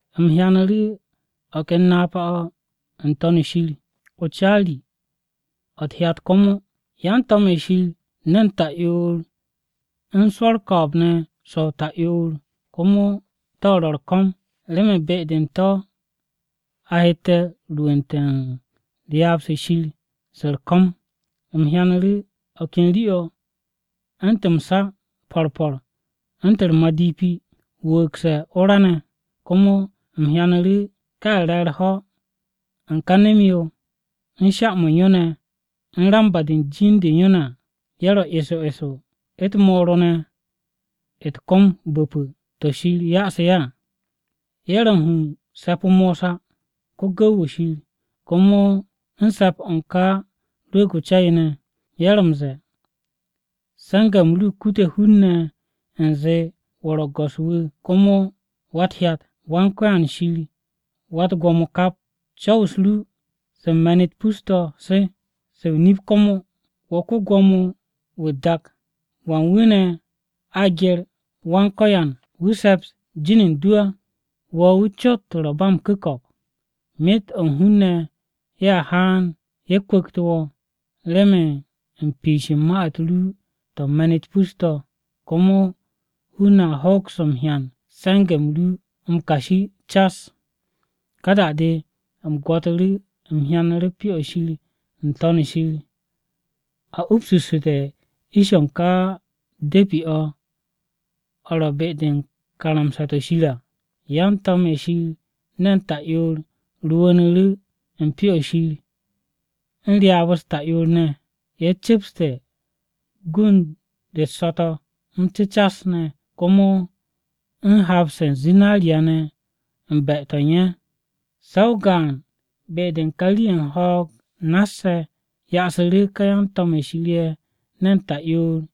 U̱m hyanu̱ru̱ o̱ ken napa-o̱ n-To̱n u̱n Shir, o-caari, o̱ u̱t-hyat komo: Yan-to̱m-ye̱ Shir ne̱n ta'yoor u̱n swo̱ u̱r-ko̱o̱b ne̱ so̱-o ta'yoor, komo to̱ to̱ ro̱ u̱r-ko̱m, remen be-de u̱n to̱ a hette̱ rwu̱u̱nte̱ u̱n ryaab-se Shir se u̱r-ko̱m. U̱m hyanu̱ru̱ o̱ ken rii-o̱ u̱ntu̱n m-sa po̱r po̱r u̱ntu̱n o-madipi, wu̱u̱gse̱ o-ra ne̱. Komo u̱m hyanu̱ru̱ ká ye̱ re̱ u̱r-ho̱ u̱n ká nem-yo ne̱ u̱n sha-mo̱ u̱n yo ne̱ u̱n ramba-de u̱n jin-de u̱n yo ne̱ à. Ye̱ ro̱ eso eso u̱t-moro ne̱ u̱t-kom bu̱pu̱ to̱ Shir ya'asu̱ ye̱ à Ye̱ ro̱ u̱n hu u̱n se̱p-o Mosa, ko-gu̱w-wu̱ Shir, komo u̱n se̱p-o̱ u̱n ká Ya Rwu̱u̱g-o Ca-yo ne̱, ye̱ ro̱ m-ze̱e̱, “Se̱nge̱-m ru kutute̱ hun-ne̱ u̱nze wo̱ ro̱ go̱s-wu̱ komo Wa-u̱t-Hyat, Wan-Ko̱yan Shir Wa-u̱t-Gwo̱mo kap! Co̱w-u̱s ru se u̱n me̱n-u̱t pus-to̱ se, se o-nip komo, wo̱ ko-Gwo̱mo-wu̱ u̱t-dak! ¿Wan wu̱ ne̱ a gye̱r Wan-Ko̱yan, wu̱ se̱ps jin u̱n du á? Wo̱ wu̱ cot ro̱ ba m-ku̱ko̱p. Myet o̱ u̱n hun-ne̱ ye̱a haan, ye̱ kwu̱ktu̱ wo̱ remen u̱n piish u̱n ma-u̱t ru to̱ u̱n me̱n-u̱t pus-to̱. Komo hun-ne̱ hoks m-hyan se̱nge̱-m ru m-kashi cas cas.” Ka da-de u̱m gwo̱tu̱ru̱ u̱m hyanu̱ru̱ Pyo-o̱ Shir n-To̱n shir. A upsu̱sse̱te̱ ish-o̱ u̱n ká de̱pi-o̱, o̱ ro̱ be-de u̱n karamsa-to̱ Shir à. Yan-to̱m-ye̱ Shir ne̱n ta'yoor rwu̱u̱nu̱ru̱ u̱n Pyo-o̱ Shir u̱n ryaab-u̱s ta'yoor ne̱. Ye̱ cu̱pste̱ gund-u̱t so̱-to̱ m-cu̱cas ne̱, komo u̱n hap-se u̱n zinariya ne̱ u̱n be-to̱ u̱n ye̱. Se̱ o-gaan be-de u̱n ka rii-ye̱ u̱n ho̱o̱g nass-ye̱ ya'asu̱ ká yan-to̱m-ye̱ Shir ne̱n ta'yoor-ye̱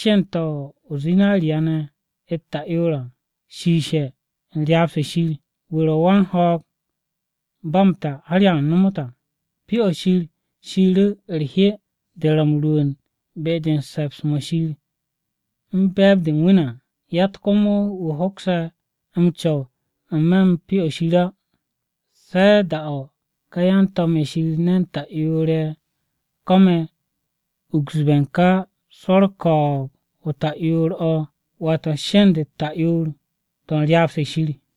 sheend-to̱ o-zinariya u̱t-ta'yoor shiishe̱ u̱n ryaab-se Shir, wu̱ ro̱ wan-ho̱o̱g ba m-ta har ya nomot à. Pyo-o̱ Shir shiiru̱ u̱r-hye de ro̱ m-rwu̱u̱n be-de u̱n se̱ps-mo̱ Shir u̱n be̱e̱b-de u̱n wu̱ ne̱ à. Yatt komo wu̱ hokse̱ m-co̱w n-me̱ u̱n ka Pyo-o̱ Shir o̱ à se̱ da-o̱ ka yan-to̱m-ye̱ Shir ne̱n ta'yoor-ye̱ ko̱me̱ uksbe̱ u̱n ká swo̱ u̱r-ko̱o̱b o-ta'yoor o̱ à, wata sheend-u̱t ta'yoor-to̱ u̱n ryaab-se Shir.